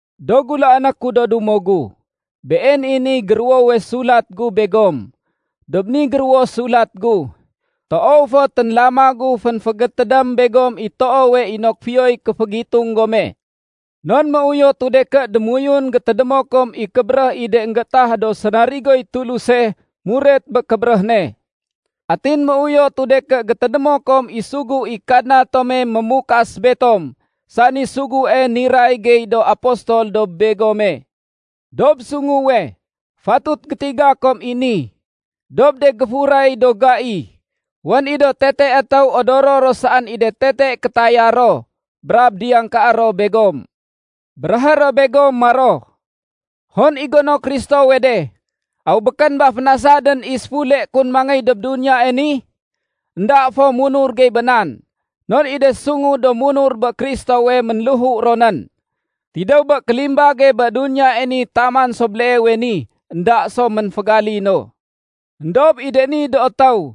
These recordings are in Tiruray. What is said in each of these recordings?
Do gulaané ku do dumo gu, been i niy géruwowe sulat gu begom. Dob ni géruwo sulat gu, toow fo ténlama gu fénfégétédém begom i toowe inok fiyoy kéfégitung gome. Non méuyotu de ké démoyun gétédémo kom i kébéréh i de énggétah do sénarigoy Tuluse muret bé kébéréh ne. Atin méuyotu de ké gétédémo kom i sugu i Kadna tome mémukas betom sani sugue niray gey do apostol dob begome. Dob sunguwe, fatut gétiga kom i ni: Dob de géfuray do gai, wén i do tete étéw odoro ro saén i de tete kétaya ro, brab diyangkaé ro begom. Béréhé ro begom maro, “Hon i gono Kristowe de? Aw békén ba fénasadén i séfule kun mangéy dob duniyae ni? Enda fo munur gey bé nan, non i de sungu do munur bé Kristowe, ménléhu ro nén. Tidéw bé kélimbage bé duniyae ni taman so béleewe ni, énda so ménfégalino.” Endob i de ni do étéw,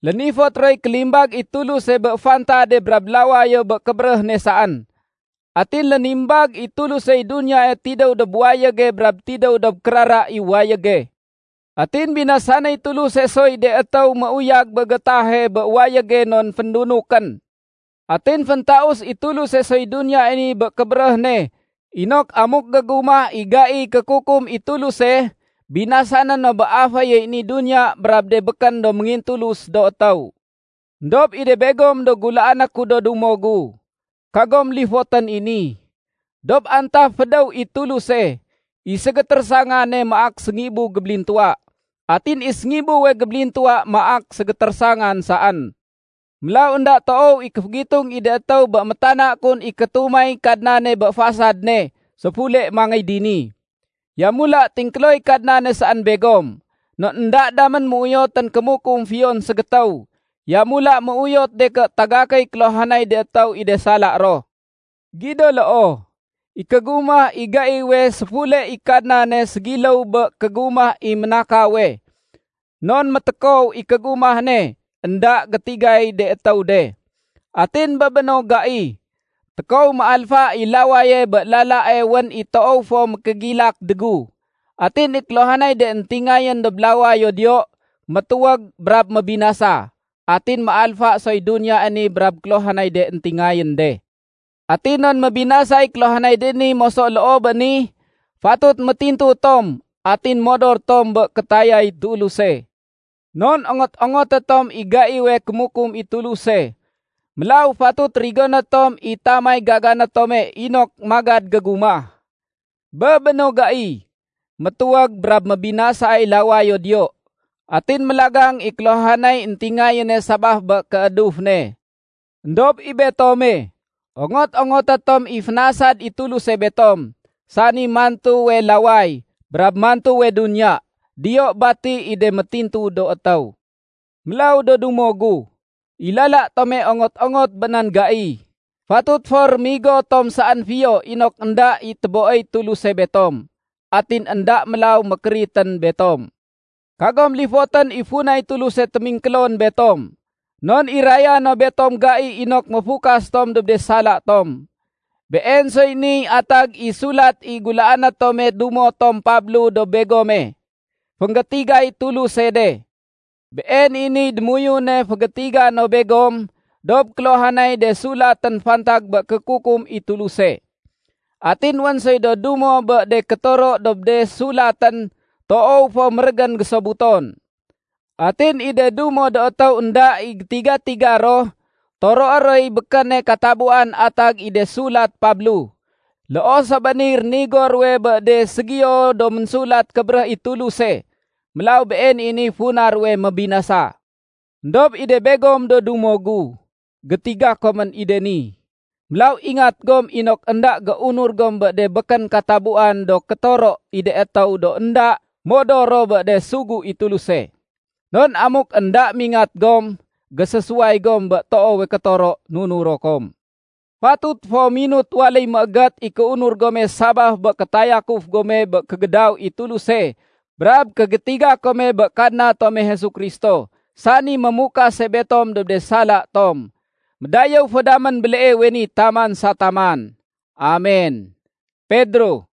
lénifot roy kélimbag i Tuluse bé fantade brab lawayo bé kébéréh ne saén. Atin lénimbag i Tulusey duniyae tidéw dob wayége brab tidéw dob kérara i wayége. Atin béninasay Tuluse soy de étéw méuyag bé gétahe bé wayége non féndunukén. Atin féntaus i Tuluse soy duniyae ni bé kébéréh ne inok amuk gégumah i gaiy kékukum i Tuluse, binasané no bé aféyey ni duniya brab de békén do méngintulus do étéw. Endob i de begom do gulaané ku do dumo gu, kagom lifotén i ni: Dob antaf fédéw i Tuluse, i ségétérésangane maak séngibu gébélintuwa, atin i séngibuwe gébélintuwa maak ségétérésangan saén. Mélaw énda toow i kéfégitung i de étéw bé métana kun i kétumay Kadnane bé fasad ne séfule mangéy dini. Yamula tingkéloy Kadnane saén begom, non énda damén méuyotén kémukum fiyon ségétéw. Yamula méuyot de ké tagakéy kéluhanay de étéw i de sala ro. Gido loo, i kégumah i gaiwe séfule i Kadnane ségiléw bé kégumah i ménakawe non métékow i kégumah ne énda gétigay de étéw de. Atin bé béno gai, tékow méalfa i lawaye bé lalae wén i toow fo mékégilak dégu. Atin i kéluhanay de éntingayén dob lawayo diyo, métuwég brab mébinasa. Atin méalfa soy duniyae ni brab kéluhanay de éntingayén de. Atin non mébinasay kéluhanay de ni moso loo bé ni, fatut métintu tom atin modor tom bé kétayay Tuluse. Non ongot-ongoté tom i gaiwe kémukum i Tuluse. Mélaw fatut rigoné tom i tamay gagané tome inok magad gégumah. Bé béno gai, métuwég brab mébinasay lawayo diyo, atin mélagang i kéluhanay éntingayéne sabaf bé kééduf ne. Endob i betome, ongot-ongoté tom i fénasad i Tuluse betom, sani mantuwe laway brab mantuwe duniya. Diyo bati i de métintu do étéw. Mélaw do dumo gu, i lala tome ongot-ongot bé nan gai, fatut fo rémigo tom saén fiyo inok énda i téboéy Tuluse betom, atin énda mélaw mékéritén betom. Kagom lifotén i funay Tuluse témingkélon betom, non iraya no betom gai inok méfukas tom dob de sala tom. Been soy niy atag i sulat i gulaané tome dumo tom Pablo dob begome. Fénggétigay Tuluse de. Been i niy démoyune fégétiga no begom dob kéluhanay de sulatén fantag bé kékukum i Tuluse. Atin wén soy do dumo bé de kétoro dob de sulatén toow fo mérégén gésobuton. Atin i de dumo do étéw énda i gétiga-tiga ro, toroé roy békéne katabuwan atag i de sulat Pablo. Loo so bé niy rénigo ruwe bé de ségiyo do Ménsulat Kébéréh i Tuluse. Mélaw been i niy funa ruwe mébinasa. Endob i de begom do dumo gu, gétiga komén i de ni. Mélaw ingat gom inok énda géunur gom bé de békén katabuwan do kétoro i de étéw do énda modor ro bé de sugu i Tuluse. Non amuk énda mingat gom, gésésuway gom bé toowe kétoro nunuro kom. Fatut fo minut waléy méégét i kéunur gome sabaf bé kétayakuf gome bé kégédaw i Tuluse brab kégétiga kome bé Kadna tome Jesu Kristo, sani mémukase betom dob de sala tom. Médayéw fo damén béleewe ni taman sa taman. Amen! Pedro